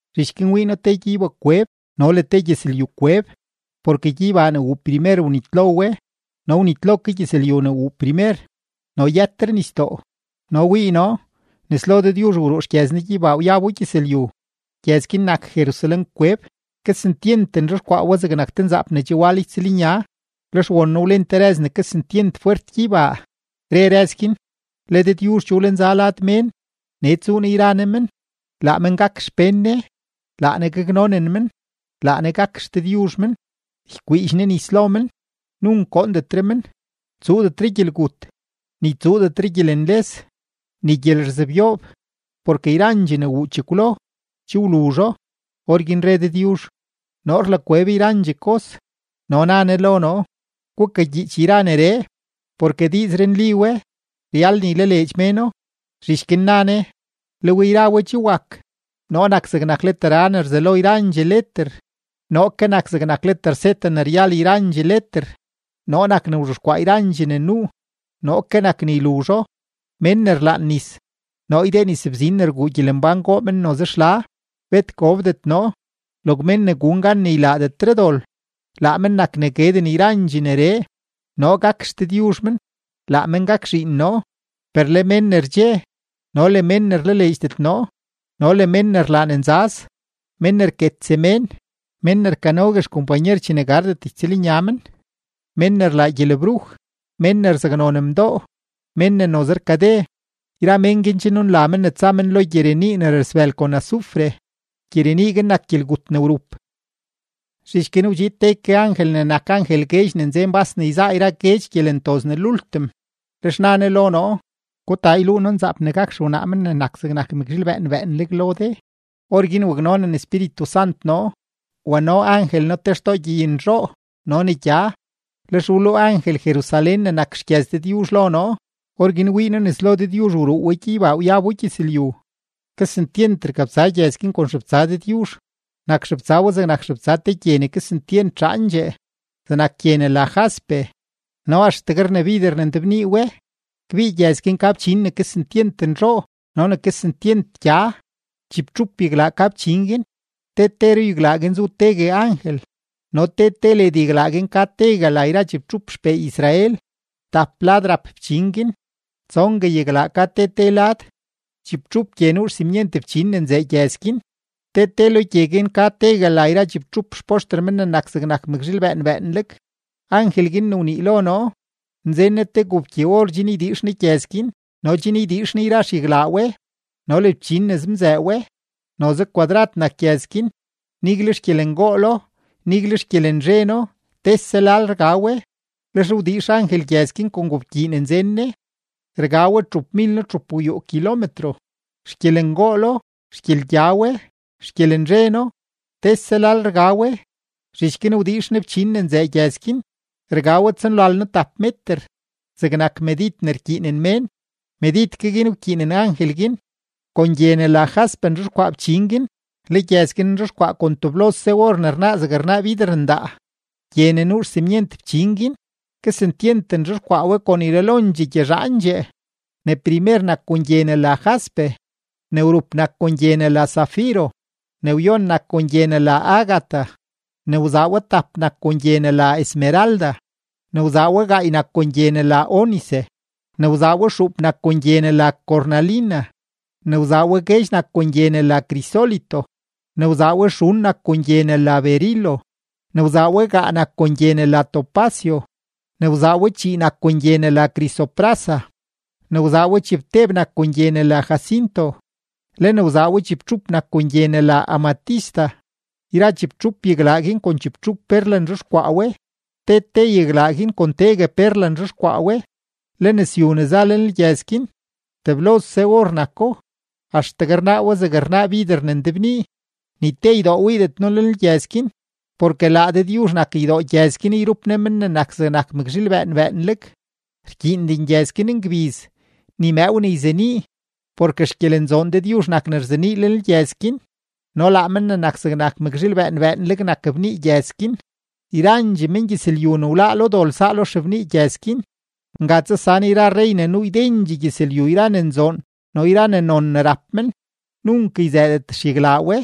Zhich guin wii noo te gyeybakweb no le te gyëzlyukweb; porke gyeybaa ne wuu primer wnitlo we no wnitlo ke gyëzlyu ne wuu primer, no yëtre nisdoo. No wii noo, nes lo Dëdyuzh wruu xgyëz Ne gyeybaa wyabo gyëzlyu, gyëz guin nak Jerusalén-kweb; kesentyent nzhexkwaa we zegnak te nzaap ne che wal ytsëlnya. Lex won noo wlen te rëz ne kesentyent fwert gyeybaa, re rëz guin: ―Le Dëdyuzh che wlenza lad mén, nee tsuu Ne yra Ne men; laa men gak xpén Ne, laa Ne gaknonen men, laa Ne gak XDëdyuzh men. Ykwiidx Ne nis lo men, nunk goondetre men; tsuudetre gyelgut, ni tsuudetre gyelenles, ni gyelerzebyoob; porke yrandxee ne wuu chekwlo, che wluzho. Orguin re Dëdyuzh: ―Noo rlakweb yrandxee kos. No na Ne lo noo: ―Gukagyiich yra neree, porke diizree nli we, ryal ne ylaleedx méno. Zhich guin na Ne: ―Le we yra we che wak. Noo nak zegnak leter A ne rzelo yrandxee leter, noo ke nak zegnak leter Z ne ryal yrandxee leter; noo nak ne wzhexkwaa yrandxee ne nuu, noo ke nak ne yluzho. Mén ne rlaan nis, noo ydee nisbzin ne rguu gyelembán goo men noze xla, bet gobdet noo. Log mén ne gun gan ne ylaadetre dol, laa men nak ne gueden yrandxee neree; noo gak XDëdyuzh men, laa men gak zhiin noo. Per le mén ne rdxe, no le mén ne rlaleedxdet noo, no le mén ne rlaa ne nzaz, mén ne rket semén, mén ne rkanogue xkompanyer chene gardet ytsëlnya men, mén ne rlaa gyelebruj, mén ne rzaknon mdoo, mén ne noze rkade, yra mén guin che nunla men ne tsa men lo gyirenii ne rasbël kon azufre. Gyirenii guin nak gyelgut ne wrup. Zhich guin wdxiid te ke angel ne nak angel guedx ne nzen bas ne yzaa yra guedx gyelentoz ne lultim, lex na ne lo noo: ―Gutaa yluu noo nzaap ne gak xewnaa Men ne nak zegnak mëkzhiil bëën bëënleg lo de. Orguin waknonen Espíritu Sant noo, wano angel noo te xtoo gyeynzhoo no ne gya, lex wluu angel Jerusalén ne nak xgyëz Dëdyuzh lo noo; orguin wii noo nes lo Dëdyuzh wruu we gyeybaa wyabo gyëzlyu. Kesentyent rkabtsa gyëz guin kon xebtsa Dëdyuzh, nak xebtsa we zegnak xebtsa te gye ne kesentyent zhaandxee, zegnak gye ne la jaspe, no axtegue rnabider ne ndebnii we. Kbii gyëz guin ka fchin ne kesentyent nzhoo no ne kesentyent gya; chibtxup yaglaa ka fchin guin; te te ruyaglaa guin zu tegue angel; no te te led yaglaa guin ka tegue la yra chibtxup xpee Israel. Tap lad rap fchin guin; tsongue yaglaa ka te te lad. Chibtxup gye nuu xsimyent fchin ne nzëë gyëz guin; te te lo gye guin ka tegue la yra chibtxup xpoxter Men ne nak zegnak mëkzhiil bëën bëënleg. Angel guin ne wnii lo noo, nzen ne te gobkyi-or chen ydiix ne gyëz guin no chen ydiix ne yra xyaglaa we no le fchin ne zemzëë we. Noze kwadrad nak gyëz guin, nigle xgyelengoolo, nigle xgyelenzheno tese lal rga we. Lex wdiix angel gyëz guin kon gobkyii ne nzen ne; rga we txupmilno-txupgwyuu kilometro. Xgyelengoolo, xgyelgya we, xgyelenzheno tese lal rga we. Zhich guin wdiix ne fchin ne nzëë gyëz guin; rga we tsonlalno-tap meter; zegnak medid ne rkyiinen mén, medid guin ke wkyiinen angel guin. Kon gye ne la jaspe nzhexkwaa fchin guin, le gyëz guin nzhexkwaa kon teblose or ne rnaa zegne rnaa bider ndaa. Gye ne nuu xsimyent fchin guin, kesentyent nzhexkwaa we kon yralondxee gyezhaandxee: ne primer nak kon gye ne la jaspe, ne wrup nak kon gye ne la zafiro, ne wyon nak kon gye ne la ágata, ne wzaa we tap nak kon gye ne la esmeralda, ne wzaa we gaay nak kon gye ne la ónice, ne wzaa we xuup nak kon gye ne la cornalina, ne wzaa we guedx nak kon gye ne la crisólito, ne wzaa we xun nak kon gye ne la berilo, ne wzaa we gaa nak kon gye ne la topacio, ne wzaa we chii nak kon gye ne la crisoprasa, ne wzaa we chibteb nak kon gye ne la jacinto, le ne wzaa we chibtxup nak kon gye ne la amatista. Yra chibtxup yaglaa guin kon chibtxup perla nzhexkwaa we; te te yaglaa guin kon tegue perla nzhexkwaa we. Le nëzyu ne za lenlgyëz guin, teblose or nako, axtegue rnaa we zegne rnaa bider ne ndebnii. Ni te ydoo wiidet noo lenlgyëz guin, porke laa Dëdyuzh nak ydoo gyëz guin yrup Ne Men ne nak zegnak mëkzhiil bëën bëënleg. Rkyiinden gyëz guin ngbiz ni mëëw ne yzenii, porke xgyelenzoon Dëdyuzh nak ne rzenii lenlgyëz guin, no laa Men ne nak zegnak mëkzhiil bëën bëënleg nak bnii gyëz guin. Yrandxee mengyëzlyu ne wláá lo dol saa lo xebnii gyëz guin; nga tsasan yra rrey ne nuu ydendxee gyëzlyu yra ne nzoon no yra ne non ne rap men. Nunk yzëëdet xyaglaa we,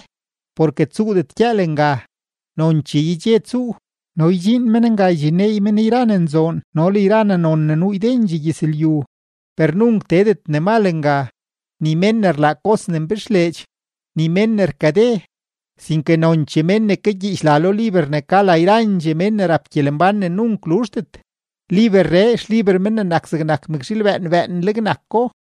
porke tsuudet gyëël nga, nonchee yedxe tsuu. No ydxiin men nga ydxinneey men yra ne nzoon no le yra ne non ne nuu ydendxee gyëzlyu. Per nunk teedet ne mal nga, ni mén ne rlaa kos ne mbixleedx, ni mén ne rkade, sinke nonchee mén ne kagyiich la lo liber ne ka la yrandxee mén ne rap gyelembán ne nunk luzhdet; liberree xliber Men ne nak zegnak mëkzhiil bëën bëënleg nako.